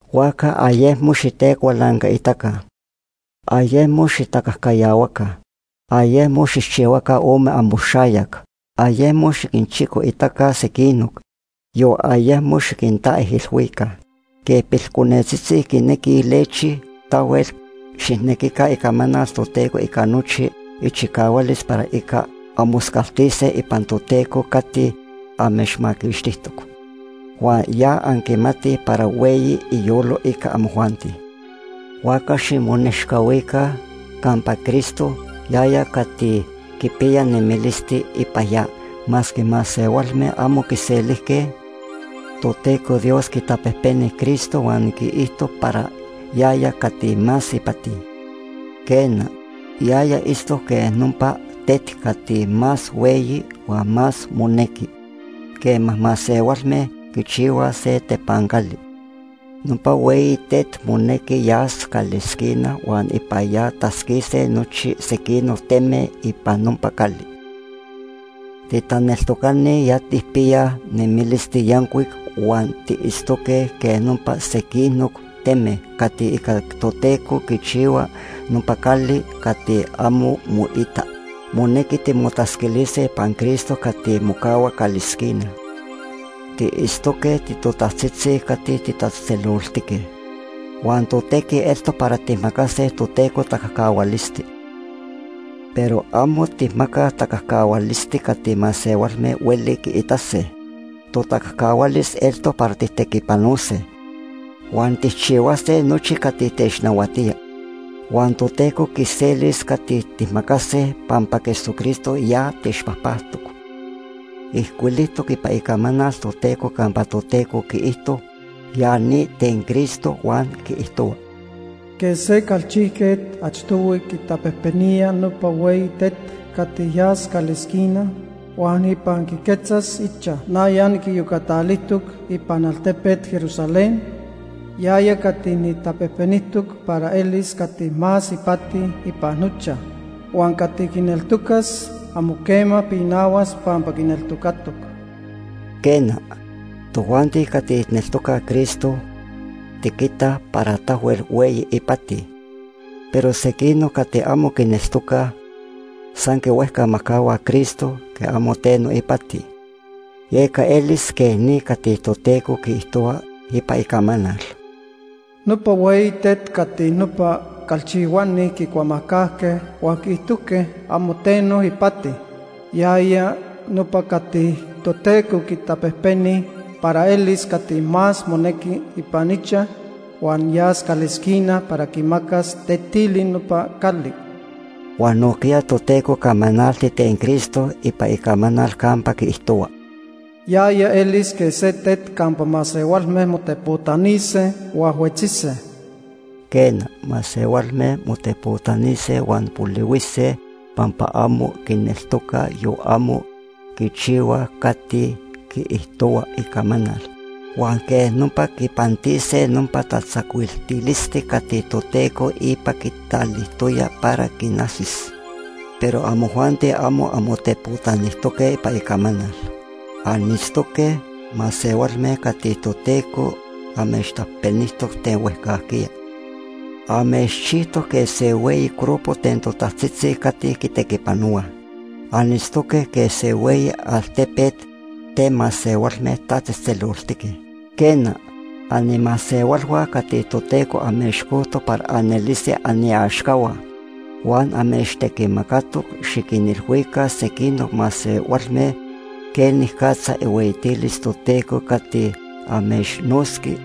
Huajca ayecmo xitecualancaitaca. Ayecmo xitacajcayahuaca. Ayecmo xijchihuaca ome amoxayac. Ayecmo xiquinchicoitaca sequinoc, yon ayecmo xiquintaijilhuica. Quej pilconetzitzi quinequij lechi, tahuel xijnequica Icamanal Toteco ica nochi ichicahualis para ica anmoscaltise ipan Toteco cati amechmaquixtijtoc, huan ya anquimatij para hueyi iyolo ica amojuanti. Huajca ximonechcahuica campa Cristo, yaya cati quipiya nemilisti ipan ya. Masque masehualme amo quiselijque, Toteco Dios quitapejpeni Cristo huan quiijto para yaya cati más ipati. Quena, yaya itztoc quej nopa tet cati más hueyi huan más monequi quema masehualme quichihuaj se tepancali. Nopa hueyi tet monequi yas calesquina huan ipan ya tatzquise nochi sequinoc teme ipan nopa cali. Titaneltocani ya tijpiyaj nemilisti yancuic huan tiitztoque quej nopa sequinoc teme cati ica Toteco quichihua nopa cali cati amo moita. Monequi timotatzquilise ipan Cristo cati mocahua calesquina. Tiitztoque titotajtzitzi cati titatzejtzeloltique. Huan totequi eltoc para tijmacase Toteco tacajcahualisti. Pero amo tijmacaj tacajcahualisti cati masehualme hueli quiitase. Totacajcahualis eltoc para tijtequipanose, huan tijchihuase nochi cati technahuatía. Huan Toteco quiselis cati tijmacase pampa Jesucristo ya techpajpactoc. Ijcuilijtoc ipan Icamanal Toteco campa Toteco quiijto ya ni ten Cristo, huan quiijtohua: “Quej se calchijquet achtohui quitapejpenía nopa hueyi tet cati yas calesquina huan ipan quiquetzas ichaj, na ya niquiyocatalijtoc ipan altepet Jerusalén yaya cati nijtapejpenijtoc para elis cati más ipati ipan nochaj. Huan cati quineltocas amo quema pinahuas pampa quineltocatoc.” Quena, tojuanti cati tijneltocaj Cristo, tiquitaj para tahuel hueyi ipati. Pero sequinoc cati amo quineltocaj, san quihuejcamajcahuaj Cristo quej amo teno ipati. Yeca elis quej ni cati Toteco quiijtohua ipan Icamanal: “Nopa hueyi tet cati nopa calchihuani quicuamajcajque huan quiijtojque amo teno ipati, yaya nopa cati Toteco quitapejpeni para elis cati más monequi ipan ichaj huan yas calesquina para quimacas tetili nopa cali.” Huan nojquiya Toteco camanalti ten Cristo ipan Icamanal campa quiijtohua: “Yaya elis quej se tet campa masehualme motepotanise huan huetzise.” Quena, masehualme motepotanise huan polihuise pampa amo quineltocaj yon amo quichihuaj cati quiijtohua Icamanal, huan quej nopa quipantise nopa tatzacuiltilisti cati Toteco ipa quitalijtoya para quinajsis. Pero amojuanti amo anmotepotanijtoque ipan Icamanal. Anitztoque masehualme cati Toteco amechtapejpenijtoc ten huejcajquiya. Amechchijtoc quej se hueyi grupo ten totajtzitzi cati quitequipanohuaj. Anitztoque quej se hueyi altepet ten masehualme tatzejtzeloltique. Quena, animasehualhua cati Toteco amechcojtoc para anelise aniaxcahua. Huan amechtequimacatoc xiquinilhuica sequinoc masehualme quenicatza ihueyitilis Toteco cati amechnotzqui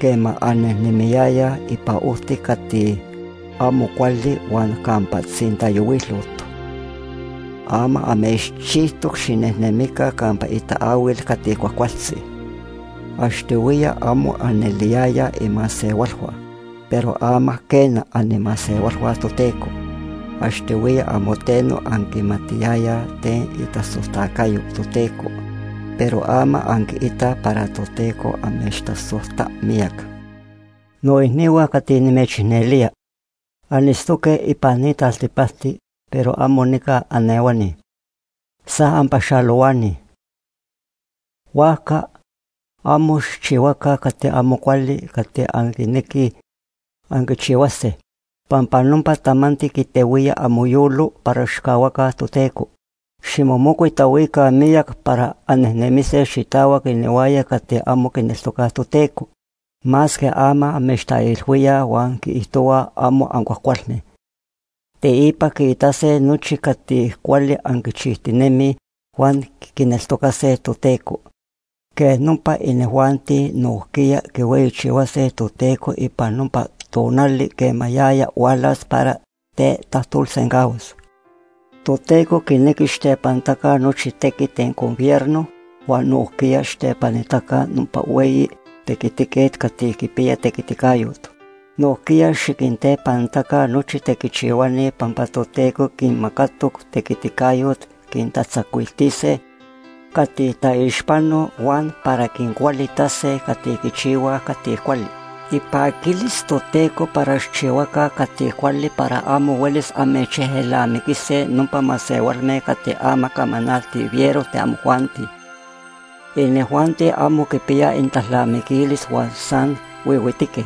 quema annejnemiyayaj ipan ojti cati amo cuali huan campa tzintayohuilot. Ama amechchijtoc xinejnemica campa itaahuil cati cuajcualtzi. Achtohuiya amo aneliyayaj imasehualhua, pero ama quena, animasehualhua Toteco. Achtohuiya amo teno anquimatiyayaj ten itasojtacayo Toteco, pero ama anquiitaj para Toteco amechtasojta miyac. Noicnihua cati nimechicnelía. Anitztoque ipan ni taltipacti pero amo nica anehuani, san anpaxalohuani. Huajca amo xijchihuaca cati amo cuali cati anquinequij anquichihuase, pampa nopa tamanti quitehuía amoyolo para xijcahuaca Toteco. Ximomocuitahuica miyac para annejnemise xitahuac inihuaya cati amo quineltocaj Toteco. Masque ama amechtaijilhuíaj huan quiijtohuaj amo ancuajcualme, teipa quiitase nochi cati cuali anquichijtinemij huan quineltocase Toteco. Quej nopa inijuanti nojquiya quihueyichihuase Toteco ipan nopa tonali quema yaya hualas para tetajtolsencahuas. Toteco quinequi xijtepanitaca nochi tequit ten gobierno huan nojquiya xijtepanitaca nopa hueyi tequitiquet cati quipiya tequiticayot. Nojquiya xiquintepanitaca nochi tequichihuani pampa Toteco quinmacatoc tequiticayot quintatzacuiltise cati taixpanoj huan para quincualitase cati quichihuaj cati cuali. Ipaquilis Toteco para xijchihuaca cati cuali para amo huelis amechejelnamiquise nopa masehualme cati ama camanaltij fiero ten amojuanti. Inijuanti amo quipiyaj inintalnamiquilis huan san huihuitique.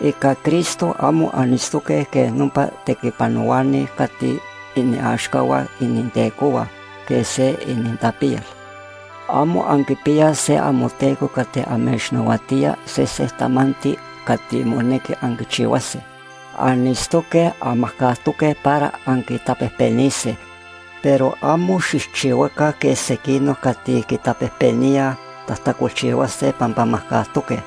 Ica Cristo amo anitztoque quej nopa tequipanohuani cati iniaxcahua inintecohua quej se inintapiyal. Amo anquipiyaj se amoteco cati amechnahuatía sese tamanti cati monequi anquichihuase. Anitztoque anmajcajtoque para anquitapejpenise, pero amo xijchihuaca quej sequinoc cati quitapejpeníaj tajtacolchihuase pampa majcajtoque.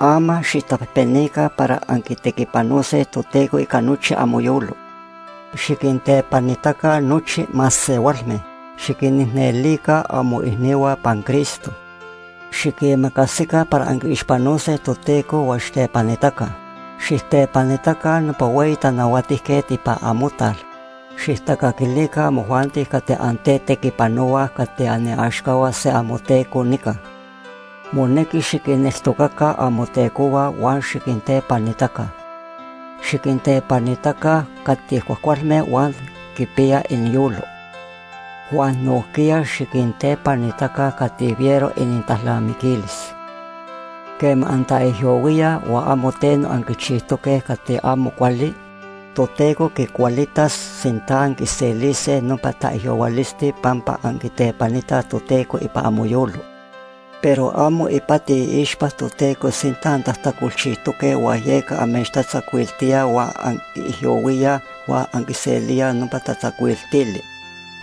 Ama xijtapejpenica para anquitequipanose Toteco ica nochi amoyolo. Xiquintepanitaca nochi masehualme. Xiquinicnelica amoicnihua ipan Cristo. Xiquimacasica para anquiixpanose Toteco huan xijtepanitaca. Xijtepanitaca nopa hueyi tanahuatijquet ipan amotal. Xijtacaquilica amojuanti cati antetequipanohuaj cati aniaxcahua se amoteco nica. Monequi xiquinneltocaca amotecohua huan xiquintepanitaca. Xiquintepanitaca cati cuajcualme huan quipiyaj iniyolo, huan nojquiya xiquintepanitaca cati fiero inintalnamiquilis. Quema antaijyohuíaj huan amo teno anquichijtoque cati amo cuali, Toteco quicualitas sinta anquiselise nopa taijyohuilisti pampa anquitepanitaj Toteco ipan amoyolo. Pero amo ipati iixpa Toteco sinta antajtacolchijtoque huan yeca amechtatzacuiltíaj huan anquiijyohuíaj huan anquiselíaj nopa tatzacuiltili,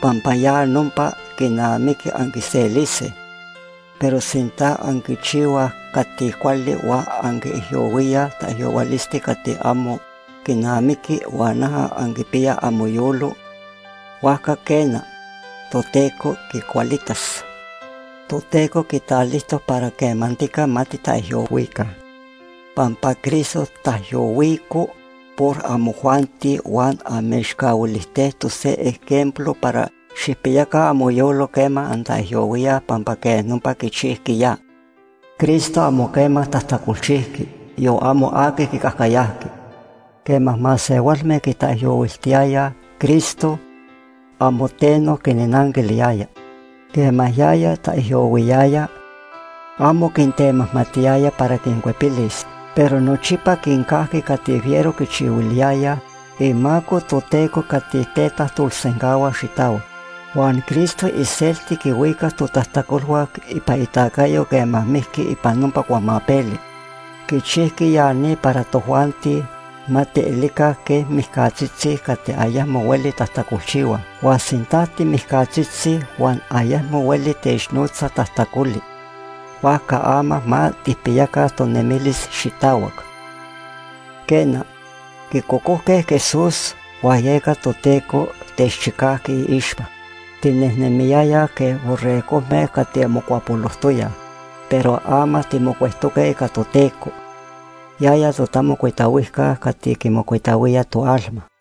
pampa ya nopa quinamiqui anquiselise. Pero sinta anquichihuaj cati cuali huan anquiijyohuíaj taijyohuilisti cati amo quinamiqui huan noja anquipiyaj amoyolo, huajca quena, Toteco quicualitas. Toteco quitalijtoc para quemantica ma titaijyohuica. Pampa Cristo taijyohuico por amojuanti huan amechcahuilijtejtoc se ejemplo para xijpiyaca amoyolo quema antaijyohuíaj pampa quej nopa quichijqui ya. Cristo amo quema tajtacolchijqui, yon amo aqui quicajcayajqui. Quema masehualme quitaijyohuiltiyayaj Cristo, amo teno quinnanquiliyaya. Quema yaya taijyohuiyaya, amo quintemajmatiyaya para quincuepilis. Pero nochipa quincajqui cati fiero quichihuiliyayaj, imaco Toteco cati tetajtolsencahua xitahuac. Huan Cristo iselti quihuicac totajtacolhua ipan itacayo quema mijqui ipan nopa cuamapeli. Quichijqui ya ni para tojuanti ma tielica quej mijcatzitzi cati ayecmo hueli tajtacolchihuaj. Huan sinta timijcatzitzi huan ayecmo hueli technotza tajtacoli, huajca ama ma tijpiyaca tonemilis xitahuac. Quena, quicocojque Jesús huan yeca Toteco techchicajqui iixpa. Tinejnemiyayaj quej borregojme cati mocuapolojtoyaj, pero ama timocuectoque ica Toteco, yaya totamocuitahuijca cati quimocuitahuía toalma.